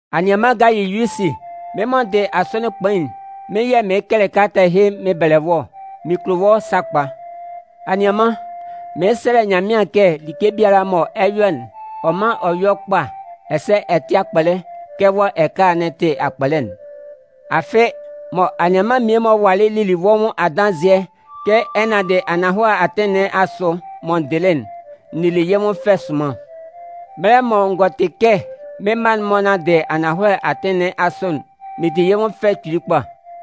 Anianman Gayiyusi, Mɩ́n mɔ n dɩ Asɔnɩn Kpain'n, mɩ́n yɛ̂ mɩɩn kɛlɛ kalata ɛhɩ mɩn bɛlɛ wɔ́ ɔ. Mɩn kulo wɔ́ sakpa. Anianman, mɩɩn sɛlɛ Nyanmɩan kɛ like biala mɔ ɛ 'yɔ'n, ɔ mán ɔ yɔ́ kpa, ɛsɛ ɛ tɩ́ akpɔlɛ kɛ wɔ́ ɛkala'n tɩ akpɔlɛ'n. Afɩ, mɔ anianman mmie-mɔ walɩ lili wɔ́ nwʋn adanzɩɛ kɛ ɛ nanndɩ ananhɔlɛ atɩn nɩn asʋ mɔ n dɩlɩ'n, n nili yɩ́ nwʋn fɛ sʋnman. Mɛlɛ mɔ n gɔ tɩ kɛ mɩ́n mma'n-mɔ nanndɩ ananhɔlɛ atɩn nɩn asʋ'n, mɩn di yɩ́ nwʋn fɛ kpili kpa.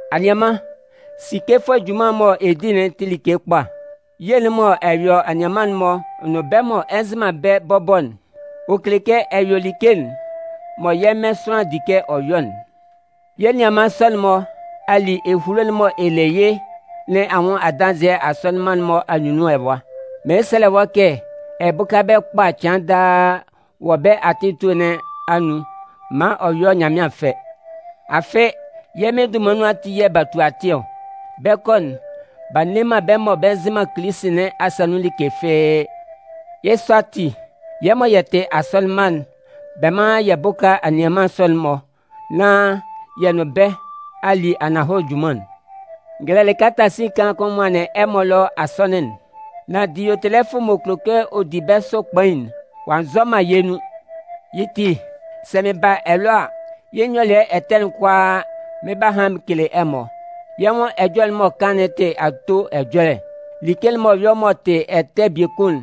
Anianman, sikefʋɛ junman'n mɔ ɛ di'n tɩ like kpa. Ye'n mɔ ɛ yɔ anianman'n-mɔ nʋn bɛ́ mɔ ɛ nzɩ man bɛ́ bɔbɔ'n, ɔ kele kɛ ɛ yɔ like'n mɔ yɛ́ Mɩn sʋanlan di kɛ ɔ yɔ'n. Yɛ́ nianman sɔ'n-mɔ a li ehulo'n mɔ ɛ le yɩ́ nɩn anwʋn adanzɩɛ asɔnɩn mma'n-mɔ anyunnun ɛwa. Mɩɩn sɛlɛ wɔ́ kɛ ɛ bʋ́ka bɛ́ kpa cɩan daa wɔ bɛ́ atɩn etue nɩn anun maan ɔ yɔ́ Nyanmɩan fɛ. Afɩ, yɛ́ Mɩn dunman nun ati yɛ̂ b'a tu atɩn ɔ. Bɛ 'kɔ'n, b'a nne man bɛ́ mɔ bɛ nzɩ man Kilisi nɩn asa nun like fɩ́ɩ́. Yɩ́ sɔ ati, yɛ́ mɔ yɛ tɩ asɔnɩn mma'n, bɛ mán yɛ bʋ́ka anianman sɔ'n-mɔ nán yɛ nʋn bɛ́ a li ananhɔlɛ junman'n. N gɛlɛlɩ kalata sin kaan kʋn n nwanlɩn ɛmɔ ɛlɔ asɔnɩn'n. Nan Diyotɛlɛfʋ m'ɔ kulo kɛ ɔ di bɛ́ sʋ kpain'n, ɔ'a nzɔ man yɛ́ nun. Yɩ́ ti, sɛ mɩn ba ɛlɔ a, yɩ́ nyɔlɩɛ ɛtɛ'n kʋalaa, mɩn 'ba han mɩn kele ɛmɔ. Yɛ́ nwʋn ɛjɔlɛ'n m'ɔ kan'n tɩ ato ɛjɔlɛ. Like m'ɔ yɔ m'ɔ tɩ ɛtɛ biekun'n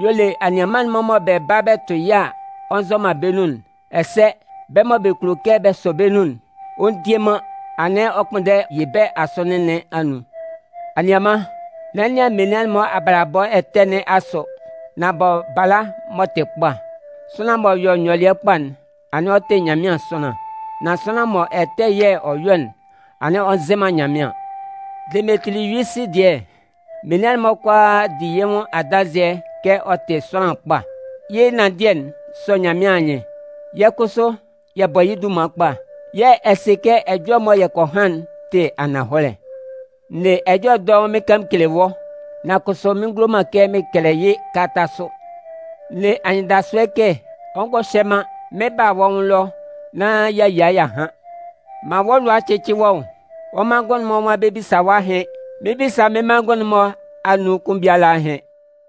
y'ɔ le anianman'n-mɔ mɔ bɛ ba tʋ yɩ́ a, ɔ nzɔ man bɛ́ nun'n. Ɛsɛ, bɛ́ mɔ bɛ kulo kɛ bɛ sɔ bɛ́ nun'n, ɔ ndie man, anɩn ɔ 'kpʋnndɛ yɩ bɛ́ asɔnɩn nɩn anun. Anianman, n'ɛ nɩan menian-mɔ abalabɔ ɛtɛ nɩn asʋ, nan bɔ bala m'ɔ tɩ kpa. Sʋanlan m'ɔ yɔ nyɔlɩɛ kpa'n, anɩn ɔ tɩ Nyanmɩan sʋanlan. Nan sʋanlan mɔ ɛtɛ yɛ̂ ɔ yɔ'n, anɩn ɔ nzɩ man Nyanmɩan. Demetiliyusi dɩɛ, menian'n-mɔ kʋalaa di yɩ́ nwʋn adanzɩɛ kɛ ɔ tɩ sʋanlan kpa. Yɩ́ ɛnanndɩɛ'n sɔ yɛ́ Mɩn anyɩn. Yɛ́ kʋsʋ yɛ bɔ yɩ́ dunman kpa, yɛ̂ ɛ sɩ kɛ ɛjɔlɛ mɔ yɛ kɔ han'n tɩ ananhɔlɛ. N ne ɛjɔlɛ dɔʋn mɩn kan mɩn kele wɔ́, nan kʋsʋ mɩn ngulo man kɛ mɩn kɛlɛ yɩ́ kalata sʋ. N ne anyɩndasʋɛ kɛ, ɔ ngɔ hyɛ man, mɩn 'ba a wɔ́ nwʋn ɛlɔ, nán y'a yia y'a han. Man wɔ́ lʋa cɩ́cɩ wɔ́ nwʋn. Wɔ́ manngʋn'n-mɔ nwan bɛ 'bisa wɔ́ ahɩn. Mɩn 'bisa mɩ́n manngʋn'n-mɔ anun kʋn biala ahɩn.